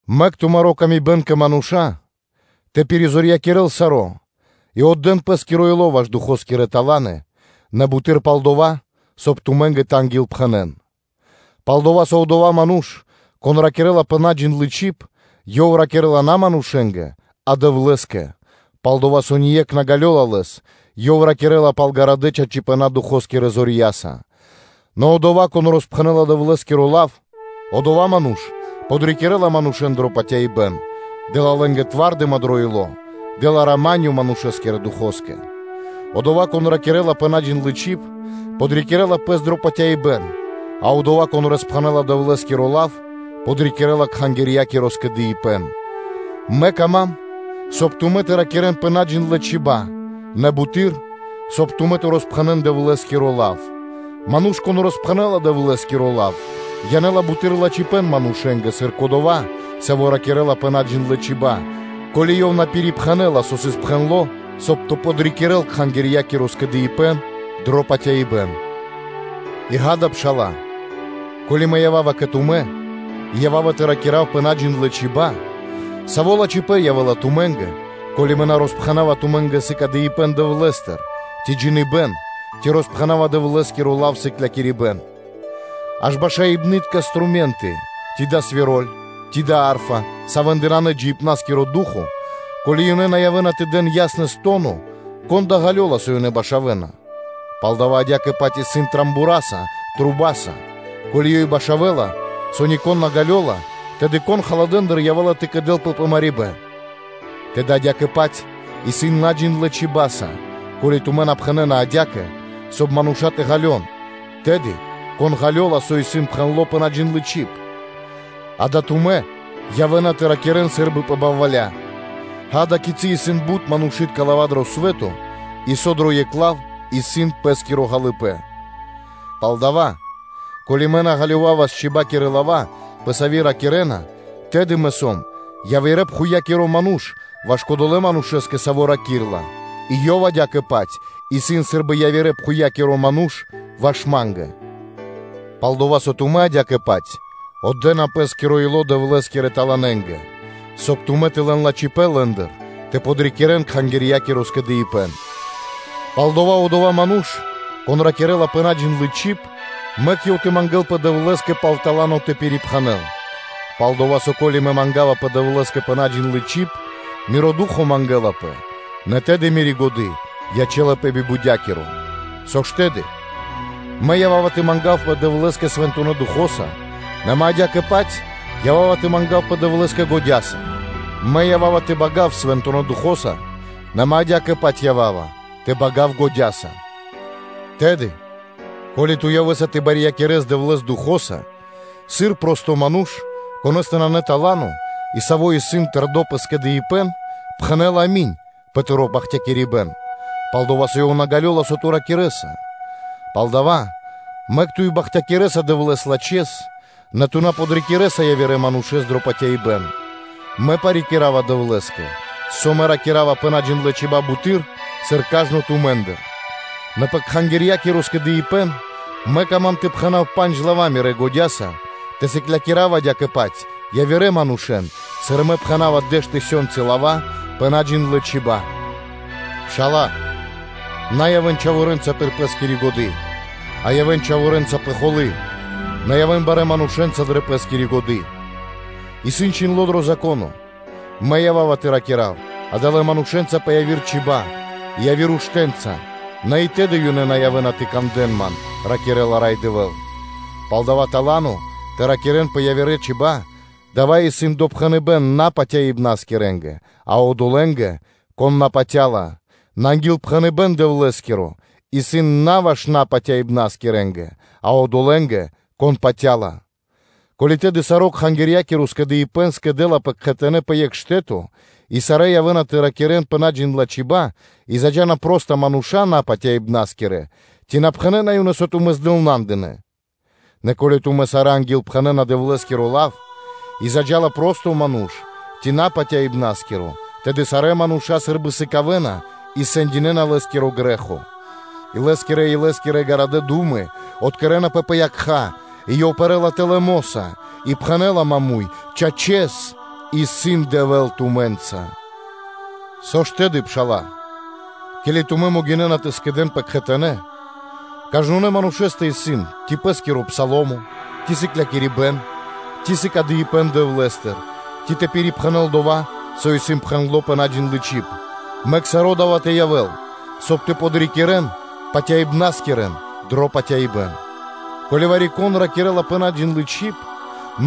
Мэк тумари́ пшалы́тко паты́в кэ мануша́ тэ пиризорьякирэл саро́, и отдэ́н пэ́скиро ило́ зэвлыныпныткэс (ревноснэс) ваш Духо́скирэ таланы, нэ буты́р пал дова́, соб (кай) тумэ́нгэ тэ ангилпхэнэн. Пал-дова́ со одова́ ману́ш, кон ракирэ́ла пэ наджиндлы чиб, ёв ракирэ́ла на манушэ́нгэ, а Дэвлэ́скэ, пал-дова́ со ние́кх на ґалёла лэс, ёв ракирэ́ла пал чораханэ чачипэна́ Духо́скирэ зорья́са. Нэ одова́, кон роспхэнэ́ла Дэвлэ́скиро лав, одова́ ману́ш подрикирэ́ла манушэ́н дро патяибэ́н, дэ́ла лэ́нгэ тва́рдыма дро ило́, дэ́ла рама́нё (миро) манушэ́скирэ Духоскэ. Одова́, кон ракирэ́ла пэ наджиндлы чиб, подрикирэ́ла пэс дро патяибэ́н; а одова́, кон роспхэнэ́ла Дэвлэ́скиро лав, подрикирэ́ла Кхангирья́киро скэдыибэ́н. Мэ кама́м, соб (кай) тумэ́ тэ ракирэ́н пэ наджиндлэ чиба́ (чибья́), нэ буты́р, соб (кай) тумэ́ тэ ангилпхэнэн (тэ роспхэнэ́н) Дэвлэ́скиро лав. Ману́ш, кон ангилпхэнэла (пророчынэла) Дэвлэ́скиро лав, янэ́ла буты́р лачхипэ́н манушэ́нгэ, сыр кодова́, саво́ ракирэ́ла пэ наджиндлэ чиба́, ко́ли ёв на пирипхэнэла, со сыс пхэндло́, соб (кай) тэ подрикирэ́л Кхангирья́киро скэдыибэ́н дро патяибэ́н. И, ґа́да, пша́ла, ко́ли мэ ява́ва кэ тумэ́ и ява́ва тэ ракира́в пэ наджиндлэ чиба́ (чибья́), саво́ лачхипэ́н явэ́ла тумэ́нгэ, ко́ли мэ на роспхэнава тумэ́нгэ сыкадыибэн Дэвлэ́стыр, ци джиныбэ́н, ци роспхэнава Дэвлэ́скиро лав/сыклякирибэ́н? Аж башаибнытка струме́нты, ци дава́ исын свироль, ци дава́ исын арфа, савэ́ндэ нанэ джиибна́скиро ду́хо (фа́но), ко́ли ёнэ на явэ́на тэ дэн я́снэс то́но, кон да ґалёла, со ёнэ башавэна? Палдава́ адя́кэ-паць исын рогоса (трубаса); ко́ли ёй башавэла, со нико́н на ґалёла, тэды кон халадэндыр (рулдэндыр) явэ́ла тэ кэдэлпэ пэ марибэ́н? Тэды адя́кэ-паць исын наджиндлэ чиба́са (чибьяса): ко́ли тумэ́ на пхэнэ́на адя́кэ, соб (кай) мануша́ тэ ґалён, тэды кон ґалёла, со исын пхэндло́ пэ наджиндлы́ чиб? Дава́ тумэ́ явэ́на тэ ракирэ́н сы́рбы пэ балваля. Ѓа́да, кицы́ исын бут манушы́тка лава́ дро свэ́то, и со дро екх лав исын пэ́скиро ґалыибэ́н. Палдава́, ко́ли мэ на ґалёвавас чибакирэ лава́; пэ сави́ ракирэ́на, тэды мэ сом явирэ́-пхувья́киро ману́ш ваш кодолэ́ манушэ́скэ, саво́ ракирэ́ла, и ёв адя́кэ-паць исын сы́рбы явирэ́-пхувья́киро ману́ш ваш ма́нгэ. Пал-дова́ со тумэ́ адя́кэ-паць отдэна пэ́скиро ило́ Дэвлэ́скирэ таланэ́нгэ, соб (кай) тумэ́ тэ лэн лачхипэ́н лэ́ндыр тэ подрикирэ́л Кхангирья́киро скэдыибэ́н. Палдава́ одова́ ману́ш, кон ракирэ́ла пэ наджиндлы чиб, мэк ёв тэ мангэ́лпэ Дэвлэ́скэ пал тала́но тэ пирипхэнэл. Пал-дова́ со, ко́ли мэ мангавапэ Дэвлэ́скэ пэ наджиндлы чиб, миро ду́хо (фа́но) мангэлапэ, нэ тэды мири́ годы́ ячэ́лапэ би бутякиро. Со ж тэды? Мэ ява́ва тэ мангавпэ Дэвлэ́скэ Свэнтонэ́ Духо́са, нэ мэ адя́кэ-паць ява́ва тэ мангавпэ Дэвлэ́скэ годя́са; мэ ява́ва тэ бага́в Свэнтонэ́ Духо́са, нэ мэ адя́кэ-паць ява́ва тэ бага́в годя́са. Тэды, ко́ли ту явэ́са тэ барьякирэс Дэвлэ́с Духо́са, сыр просто ману́ш, конэ́стэ нанэ тала́но и саво́ исын тэрдо́ пэ скэдыибэ́н, пхэнэ́ла “ами́нь” пэ тыро́ бахтякирибэ́н, пал-дова́ со ёв на ґалёла, со ту ракирэ́са? Палдава́, мэк ту и бахтякирэса Дэвлэ́с лачхэ́с, нэ ту на подрикирэса явирэ манушэ́н дро патяибэ́н. Мэ парикирава Дэвлэ́скэ, со мэ ракира́ва пэ наджиндлэ чиба́ (чибья́) буты́р, сыр кажно тумэ́ндыр: нэ пэ Кхангирья́киро скэдыибэ́н мэ кама́м тэ пхэна́в пандж лава́ мирэ́ годя́са тэ сыклякирав адя́кэ-паць явирэ манушэ́н, сыр мэ пхэна́ва дэш тысёнцы лава́ пэ наджиндлэ чиба́ (чибья́). Пшала́лэ! На явэ́н чхаворэ́нца пир пэ́скири годы́, а явэ́н чхаворэнца пэ холы́: нэ явэ́н барэ́ манушэ́нца дрэ пэ́скири годы́. Исын чхиндло́ дро Зако́но: “Мэ ява́ва тэ ракира́в адалэ́ манушэ́нца пэ яви́р чиба́ (чибья́) и явирэ уштэ́нца, нэ и тэды ёнэ на явэ́на тэ кандэ́н Ман, ракирэ́ла Рай Дэвэ́л.” Палдава́, тала́но тэ ракирэ́н пэ явирэ чиба́ (чибья́) дава́ исын допхэныбэ́н на патяибнаскирэнгэ, а одолэ́нгэ, кон на патя́ла; нэ ангилпхэныбэ́н Дэвлэ́скиро исын на ваш напатяибнаскирэнгэ, а одолэ́нгэ, кон патя́ла. Ко́ли тэды саро́ Кхангирья́киро скэдыибэ́н скэдэлапэ кхэтанэ́ пэ екх штэ́то и сарэ́ явэ́на тэ ракирэ́н наджиндлэ чибэнца (чибьенца), и заджа́на проста мануша́, напатяибнаскирэ, ци на пхэнэ́на ёнэ, со тумэ́ здылнандынэ. Нэ ко́ли тумэ́ сарэ́ ангилпхэнэна Дэвлэ́скиро лав, и заджа́ла просто ману́ш ци напатяибнаскиро, тэды сарэ́ мануша́ сы́рбы сыкавэ́на и сэндинэна лэ́скиро грэ́хо; и лэ́скирэ-илэ́скирэ гарадэ́ ду́мы откэрэнапэ пэ якха́, и ёв пэрэ́ла тэлэ́ мо́са, и пхэнэ́ла маму́й “Чачэс, исын Дэвэ́л тумэ́нца.” Со ж тэды, пшала́лэ? Ке́ли тумэ́ могинэ́на тэ скэдэ́нпэ кхэтанэ́, кажнонэ́ манушэ́стэ исын, ци пэ́скиро пса́лмо, ци сыклякирибэ́н, ци сыкадыипэн (откэрибэн) Дэвлэ́стыр, ци тэ пирипхэнэл дова́, со исын пхэндло́ пэ наджиндлы чиб, мэк саро́ дава́ тэ явэ́л, соб (кай) тэ подрикирэн патяибнаскирэн дро патяибэ́н. Ко́ли вари-кон ракирэ́ла пэ наджиндлы чиб,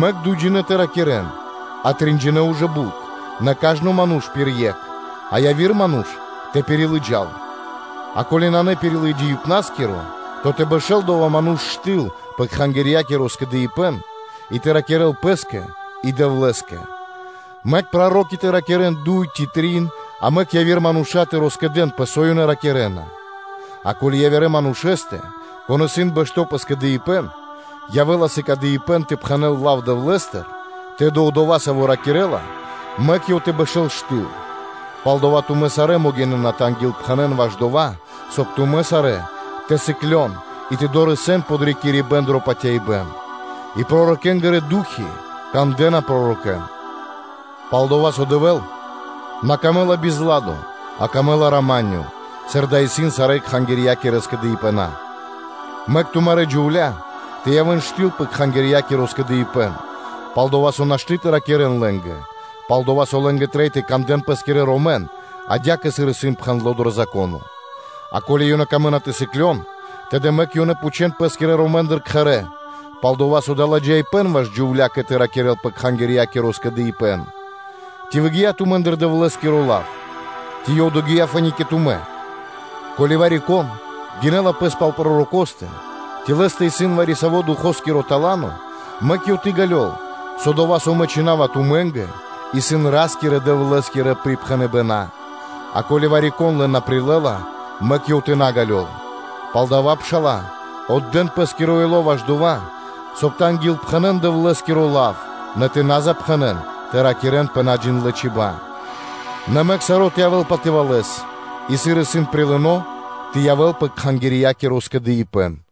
мэк дуйджинэ́ тэ ракирэ́н, а тринджинэ ужэ бут, нэ кажно ману́ш пир екх, а яви́р ману́ш тэ пирилыджал (тэ пиричхувэл); а ко́ли нанэ пирилыджаибнаскиро, то тэ бэшэ́л одова́ ману́ш штыл пэ Кхангирья́киро скэдыибэ́н, и тэ ракирэ́л пэ́скэ и Дэвлэ́скэ. Мэк проро́ки тэ ракирэ́н дуй ци трин, а мэк яви́р мануша́ тэ роскэдэнпэ, со ёнэ ракирэ́на. А ко́ли явирэ манушэ́стэ, кон исын бэшто́ пэ скэдыибэ́н, явэ́ла сыкадыипэн тэ пхэнэ́л лав Дэвлэ́стыр, тэды одова́, саво́ ракирэ́ла, мэк ёв тэ бэшэ́л штыл. Палдава́ тумэ́ сарэ́ могинэ́на тэ ангилпхэнэн ваш дова́, соб (кай) тумэ́ сарэ́ тэ сыклён и тэ дорэсэн подрикирибэ́н дро патяибэ́н. И пророкэ́нгирэ ду́хи кандэ́на пророкэ́н. Пал-дова́ со Дэвэ́л на прилэ́ла бизладо, а прилэ́ла рама́нё (миро), сыр дава́ исын пир сарэ́ Кхангирья́кирэ скэдыибэна. Мэк тумарэ́ джувля́ тэ явэ́н штыл пэ Кхангирья́киро скэдыибэ́н, пал-дова́ со нашты́ тэ ракирэ́н лэ́нгэ, пал-дова́ со лэ́нгэ трэй тэ кандэ́н пэ́скирэ ромэн, адя́кэ сыр исын пхэндло́ дро Зако́но. А ко́ли ёнэ камэ́на тэ сыклён, тэды мэк ёнэ тэ пхучэ́н пэ́скирэ ромэндыр кхэрэ́; пал-дова́ со дава́ ладжаипэ́н ваш джувля́кэ тэ ракирэ́л пэ Кхангирья́киро скэдыибэ́н. Ци выгия́ тумэ́ндыр Дэвлэ́скиро лав, ци ёв догия́ фэ́ни (то́ка) кэ тумэ́? Ко́ли вари-кон гинэ́ла пэс пал пророкостэ, ци лэ́стэ исын вари-саво́ Духоскиро тала́но, мэк ёв тэ ґалёл, со дова́, со мэ чхина́ва тумэ́нгэ, исын Ра́скирэ-Дэвлэ́скирэ припхэныбэна́. А ко́ли вари-кон лэн на прилэ́ла, мэк ёв тэ на ґалёл. Палдава́, пшала́лэ, отдэ́н пэ́скиро ило́ ваш дова́, соб (кай) тэ ангилпхэнэн Дэвлэ́скиро лав, нэ на запхэнэн тэ ракирэ́н наджиндлэ чибэнца (чибьенца). Нэ мэк саро́ тэ явэ́л патывалэс и адя́кэ-паць сыр исын прилыно, тэ явэ́л пэ Кхангирья́киро скэдыибэ́н.